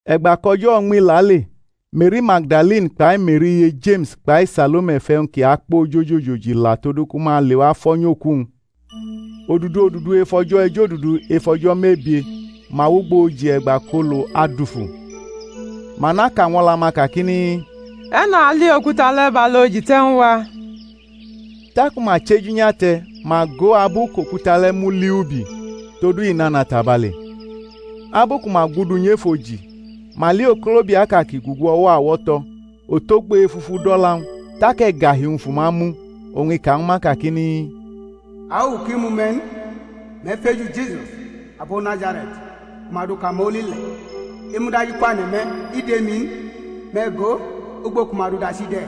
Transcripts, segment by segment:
E̩gba kʼo̩jo̩ uñmi lale, Me̩ri Magdalini kpai Me̩ri iye Jeme̩s, kpai Salome fʼe̩wñ ki akpo ojoji ojoji la todu ku ma lewa fo̩ nyʼoku-wñ. Odudu odudu ef o̩jo̩ ejodudu ef o̩jo̩ mebie, ma wʼugbo oji e̩gba kʼolu adufu. Ma naka ñw o̩la-ma, kakini, E̩ne̩ ali okuta le̩ bʼalu oji te̩ ñw a? Taku ma chʼeju nyate̩, ma go abu kʼokuta le̩ muli ubi; todu i nana tabale. Abu ku ma gudu nyʼef oji, ma li okolobiaʼka ki gugu o̩wo̩ awo̩to̩, otogbo efufu dʼo̩la-wñ; tak e̩gahi-wñ fu ma mu. Oñ i ka ñwu ma, kakini, Awuwu ki mu me̩ n; me̩ feju Jisus, abo Nazare̩t, ku ma du kamoli le̩; i mudajikwane̩ me̩; i dʼemi n; me̩ go, ugbo ku ma dʼu dachi de̩!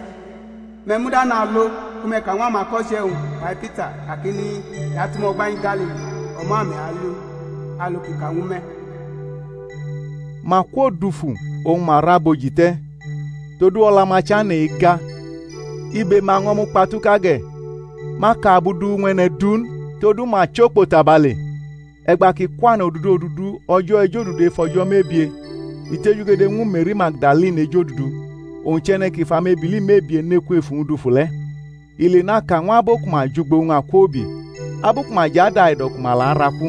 Me̩ muda nalo, ku me̩ ka ñw amako̩che̩-wñ kpai Pita kakini, I atʼume̩ o̩gba nyi Galili; o̩mo̩ ame̩ ali u, alu kʼi ka ñwu me̩. Ma kwodufu oñ ma ra bʼoji te̩; todu o̩la-ma chane̩ ega, ibe-ma ño̩ mukpatuka ge̩; ma ka abu du ñw e̩ne̩ du n; todu ma chʼokpo tabale. [ E̩gba kʼi kwane̩ odudu odudu o̩jo̩ ejodudu ef o̩jo̩ mebie, i tejugede ñwu Me̩ri Magdalini ejodudu, owñ chʼe̩ne̩ kʼi fʼamebili mebie ne kwef uwñ dufu le̩. I lenaka ñw abo ku ma jʼugbo-wñ akwoubi, abu ku ma jʼadaido̩ ku ma la araku.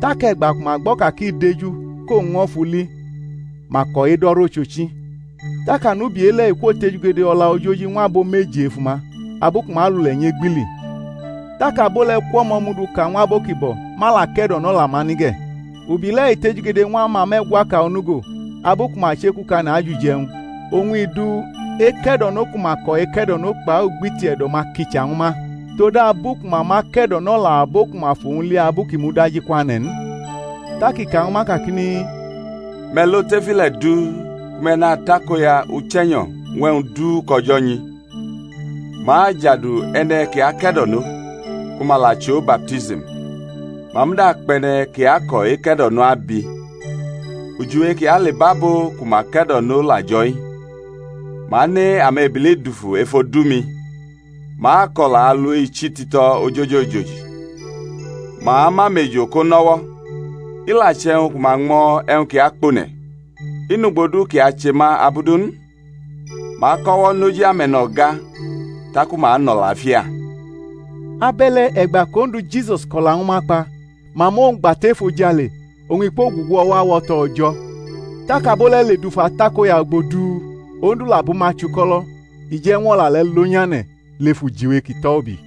Tak e̩gba ku ma gbo̩ ka kʼi deju, kʼowñ ño̩ fʼu li, ma ko̩ edo̩ rʼochochi. Tak anubi e-le̩, i kwotejugede o̩la ojoji ñw abo meji ef uma, abu ku ma alule̩ nyʼegbili. Tak abo le̩ kwʼo̩mo̩ mʼu duka ñw abo ki bo̩; ma la ke̩do̩nʼo̩la-ma ni ge̩. Ubi le̩ i tejugede ñw amame̩gwaka onugo, abu ku ma chekukane̩ ajʼuje̩wñ; oñ i du eke̩do̩no ku ma ko̩ eke̩do̩no kpai ugbiti e̩do̩-ma kicha ñwu ma, todabu ku ma ma ke̩do̩nʼo̩la abo ku ma fʼowñ li abu kʼi mudajikwane̩ n. Tak i ka ñwu ma kakini, Me̩ lo tef ile̩ du, ku me̩ natakoya uche̩nyo̩ ñw e̩wñ du kʼO̩jo̩ nyi. Ma ajadu e̩ne̩ ki ake̩do̩nʼo, ku ma la chʼo baptism. Ma muda akpʼe̩ne̩ ki ako̩ eke̩do̩no abi. Ujiwe ki alebʼabo ku ma ke̩do̩nʼo la jo̩-i: ma ane amebili dufu ef odu-mi; ma ako̩la alu ichi tito̩ ojoji ojoji; ma amʼamejo̩ ko nʼo̩wo̩; i la che̩wñ ku ma ñmo̩ e̩wñ ki akpone̩, i nʼugbo du kʼi ache ma abu du n; ma akʼo̩wo̩ nʼoji ame̩no̩ga, taku ma anʼo̩lafia. Abe̩le̩ e̩gba kʼOndu Jisus ko̩la ñwu ma kpa, ma mʼowñ gba tʼefojale, oñ i kwogugu o̩wo̩ awo̩to̩ O̩jo̩. Tak abo le̩ ledufu atakoya ugbo du, Ondu la bʼuma chuko̩lo̩, i je̩ ñw O̩la le̩ lonyane̩ lef ujiwe ki tʼo̩ ubi.]